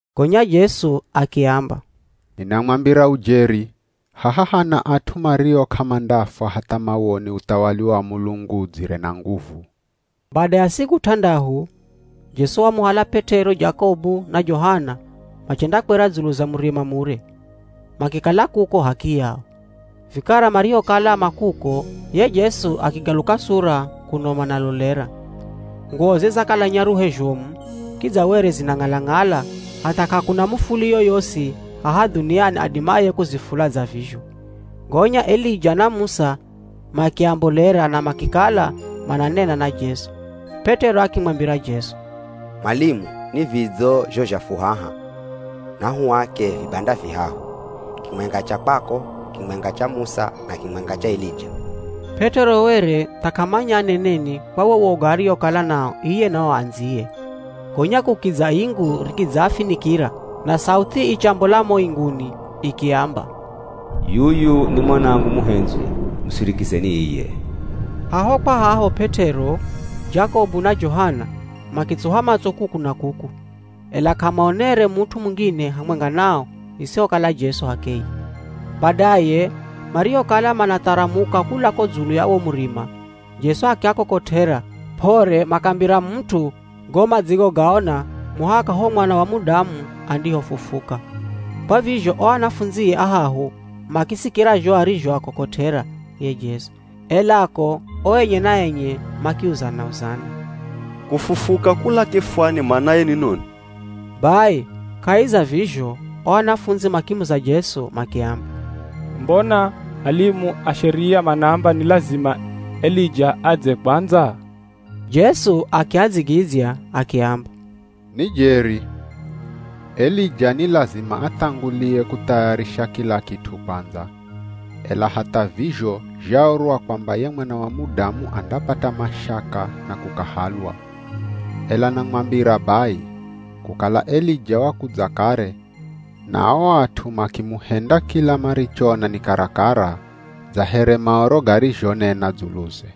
Gonya Jesu akiamba, “Ninamwambira ujeri, haha hana at'u mario k'amandafwa hatha mawone uthawali wa Mulungu udzire na nguvu.” Bada ya siku t'andahu, Jesu wamuhala P'et'ero, Jakobu na Johana machendakwera dzulu za murima mure, makikala kuko h'akiyao. Vikara marihokala ma kuko, ye Jesu akigaluka sura kuno manalolera. Nguwoze zakala nyaruhe zhomu, kidza were zinang'ala-ng'ala hatha k'akuna mufuli yoyosi haha dhuniani adimaye kuzifula dza vizho. Gonya Elija na Musa makiambolera na makikala mananena na Jesu. P'et'ero akimwambira Jesu, “Mwalimu ni vidzo zho zha fu haha! Nahuake vibanda vihahu, kimwenga cha kwako, kimwenga cha Musa na kimwenga cha Elija.” P'et'ero were tha k'amanya aneneni kwa wo woga ariokala nao iye na o andziye. Gonya kukidza ingu rikidzaafinikira na sauthi ichambola mo inguni ikiamba, “Yuyu ni Mwanangu muhendzwi, musirikizeni iye.” Haho kwa haho P'et'ero, Jakobu na Johana makitsuha matso kuku na kuku, ela k'amaonere mut'u mungine hamwenga nao isihokala Jesu h'akeye. Badaye marihokala manatharamuka kula ko dzulu ya wo murima, Jesu akiakokot'era p'ore makambira mut'u go madzigogaona muhaka ho Mwana wa Mudamu andihofufuka. Kwa vizho o anafundzie ahahu makisikira zho arizhoakokot'era ye Jesu, ela ko o enye na enye makiuzana-uzana, “Kufufuka kula kifwani manaye ni noni?” Bai kahi za vizho o anafundzi makimuza Jesu makiamba, “Mbona alimu a Sheria manaamba ni lazima Elija adze kwandza?” Jesu akiadzigidzya akiamba, “Ni jeri, Elija ni lazima athangulie kuthayarisha kila kit'u kwandza, ela hatha vizho zhaorwa kwamba ye Mwana wa Mudamu andapata mashaka na kukahalwa. Ela namwambira bai, kukala Elija wakudza kare na o at'u makimuhenda kila marichoona ni karakara dza here Maoro garizhonena dzuluze.”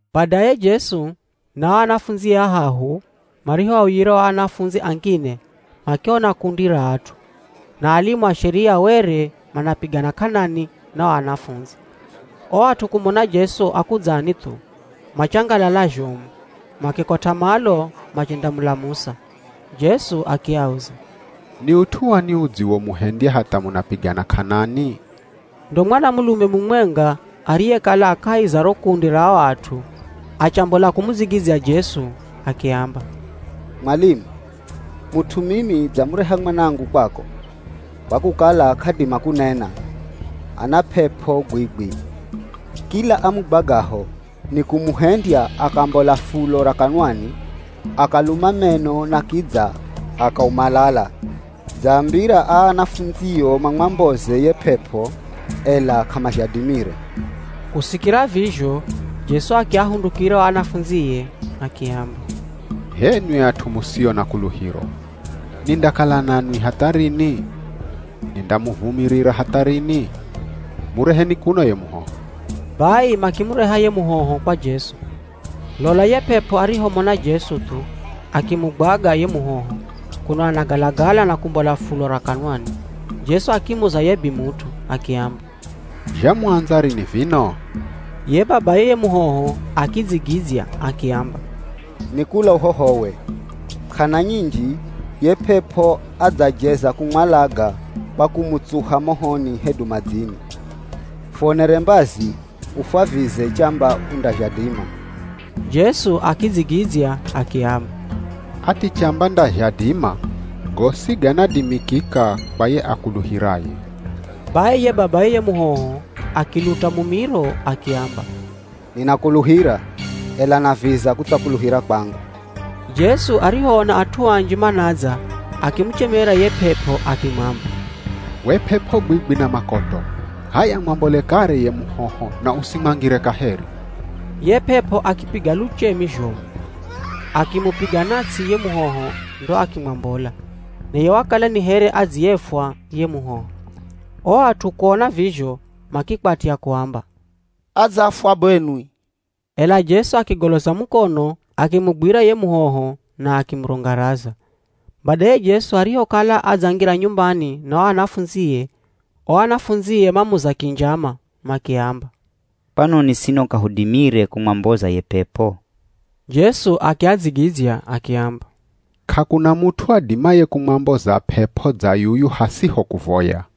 Badaye Jesu na o anafundzie ahahu marihoauyira o anafundzi angine makiona kundi ra at'u, na alimu a Sheria were manapigana k'anani na o anafundzi. O at'u kumona Jesu akudzani thu, machangalala zhomu makikot'a malo machendamulamusa. Jesu akiauza, “Ni ut'u wani udziwomuhendya hatha munapigana k'anani?” Ndo mwanamulume mumwenga ariyekala a kahi za ro kundi ra o at'u achambola kumudzigidzya Jesu akiamba, “Mwalimu, mut'u mimi dzamureha mwanangu kwako, kwa kukala k'adima kunena, ana p'ep'o bwibwi. Kila amugwagaho ni kumuhendya akambola fulo ra kanwani, akaluma meno na kidza akaumalala. Dzaambira aa anafundzio mamwamboze ye p'ep'o, ela k'amazhadimire.” Kusikira vizho Jesu akiahundukira o anafundzie, akiamba, “H'enwi at'u musio na kuluhiro! Nindakala nanwi hatha rini? Nindamuvumirira hatha rini? Mureheni kuno ye muhoho.” Bai makimureha ye muhoho kwa Jesu. Lola ye p'ep'o arihomona Jesu thu, akimugwaga ye muhoho, kuno anagalagala na kumbola fulo ra kanwani. Jesu akimuza ye bimut'u akiamba, “Zhamuandza rini vino?” Ye babaye ye muhoho akidzigidzya akiamba, “Ni kula uhohowe. K'ana nyinji ye p'ep'o adzajeza kumwalaga kwa kumutsuha mohoni hedu madzini. Fuonere mbazi ufwavize chamba undazhadima!” Jesu akidzigidzya akiamba, “Ati chamba ndazhadima? Gosi ganadimikika kwa ye akuluhiraye.” Bai ye babaye ye muhoho akiluta mumiro akiamba, “Ninakuluhira, ela naviza kutsakuluhira kwangu.” Jesu arihoona at'u anji manadza akimuchemera ye p'ep'o akimwamba, “We p'ep'o gwigwi na makoto, h'aya mwambole kare ye muhoho na usimwangire kaheri!” Ye p'ep'o akipiga luchemi zhomu, akimupiga na ts'i ye muhoho ndo akimwambola. Naye wakala ni here adziyefwa ye muhoho. O at'u kuona vizho makikwatya kuamba, “Adzafwa benwi!” Ela Jesu akigoloza mukono akimugwira ye muhoho na akimurungaraza. Badaye Jesu arihokala adzangira nyumbani na o anafundzie, o anafundzie mamuza kinjama makiamba, “Kwanoni sino k'ahudimire kumwamboza ye p'ep'o?” Jesu akiadzigidzya akiamba, “K'akuna mut'u adimaye kumwamboza p'ep'o dza yuyu hasiho kuvoya.”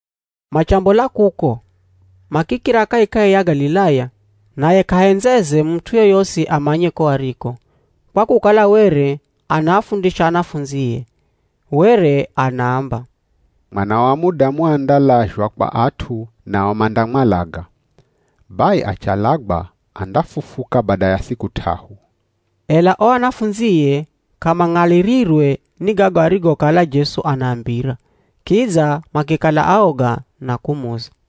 Machambola kuko, makikira kahikahi ya Galilaya. Naye k'ahendzeze mut'u yoyosi amanye ko ariko, kwa kukala were anaafundisha anafundzie. Were anaamba, “Mwana wa Mudamu andalazhwa kwa at'u nao mandamwalaga. Bai achalagwa andafufuka bada ya siku t'ahu.” Ela o anafundzie k'amang'alirirwe ni gago arigokala Jesu anaambira, kidza makikala aoga na kumuza.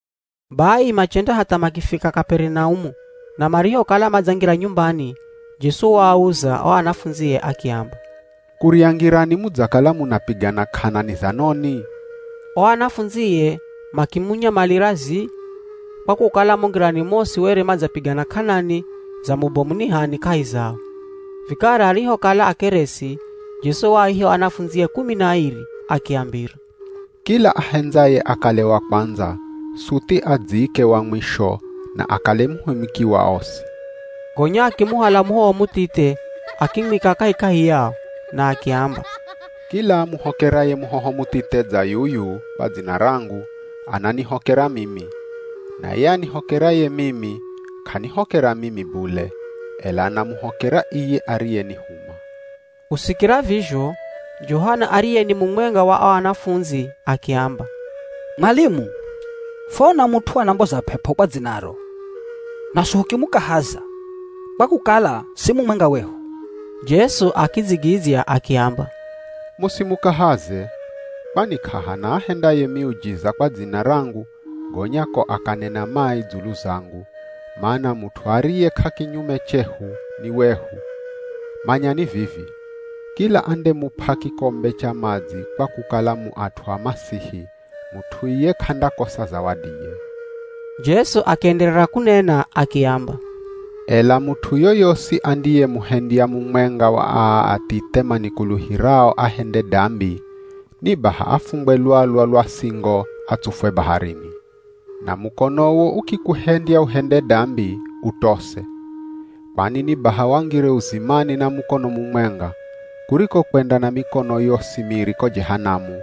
Bai machenda hatha makifika Kaperinaumu na marihokala madzangira nyumbani, Jesu waauza o anafundzie akiamba, “Kurya ngirani mudzakala munapigana k'anani za noni?” O anafundzie makimunyamalira zii, kwa kukala mo ngirani mosi were madzapigana k'anani za mubomu ni h'ani kahi zao. Vikara arihokala akeresi, Jesu waaiha o anafundzie kumi na airi akiambira, “Kila ahendzaye akale wa kwandza suthi adziike wa mwisho na akale muhumiki wa osi.” Gonya akimuhala muhoho muthithe, akimwika kahikahi yao, na akiamba, “Kila amuhokeraye muhoho muthithe dza yuyu kwa dzina rangu, ananihokera mimi, na ye anihokeraye mimi k'anihokera mimi bule, ela anamuhokera iye ariyenihuma.” Kusikira vizho, Johana ariye ni mumwenga wa o anafundzi akiamba, “Mwalimu, fwaona mut'u anamboza p'ep'o kwa dzinaro, naswi hukimukahaza, kwa kukala si mumwenga wehu.” Jesu akidzigidzya akiamba, “Musimukahaze, kwani k'ahana ahendaye miujiza kwa dzina rangu gonya ko akanena mai dzulu zangu, mana mut'u ariye k'akinyume chehu ni wehu. Manyani vivi, kila andemup'a kikombe cha madzi kwa kukala mu at'u a Masihi, mut'u iye k'andakosa zawadiye.” Jesu akienderera kunena akiamba, “Ela mut'u yoyosi andiyemuhendya mumwenga wa aa athithe manikuluhirao ahende dambi, ni baha afungwe lwalwa lwa singo atsufwe baharini. Na mukonowo ukikuhendya uhende dambi, utose. Kwani ni baha wangire uzimani na mukono mumwenga, kuriko kwenda na mikono yosi miri ko Jehanamu,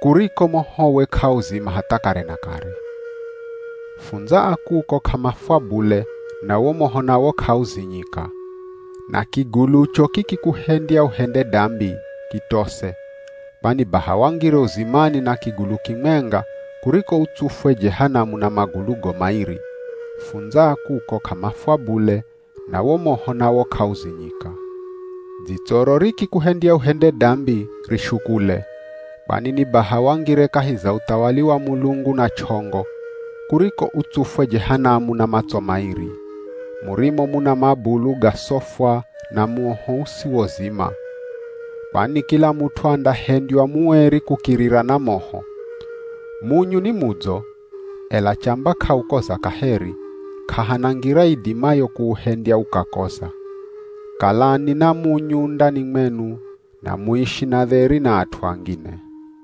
kuriko mohowe k'auzima hatha kare na kare. [ Fundza a kuko k'amafwa bule na wo moho nawo k'auzinyika.] Na kigulucho kikikuhendya uhende dambi, kitose, kwani baha wangire uzimani na kigulu kimwenga kuriko utsufwe Jehanamu na magulugo mairi. [ Fundza a kuko k'amafwa bule na wo moho nawo k'auzinyika.] Dzitsoro rikikuhendya uhende dambi, rishukule. Kwani ni baha wangire kahi za uthawali wa Mulungu na ch'ongo, kuriko utsufwe Jehanamu na matso mairi, murimo muna mabulu gasofwa na moho usiwozima. Kwani kila mut'u andahendywa mueri kukirira na moho. Munyu ni mudzo, ela chamba k'aukoza kaheri, k'ahana ngira idimayo kuuhendya ukakoza. Kalani na munyu ndani mwenu na muishi na dheri na at'u angine.”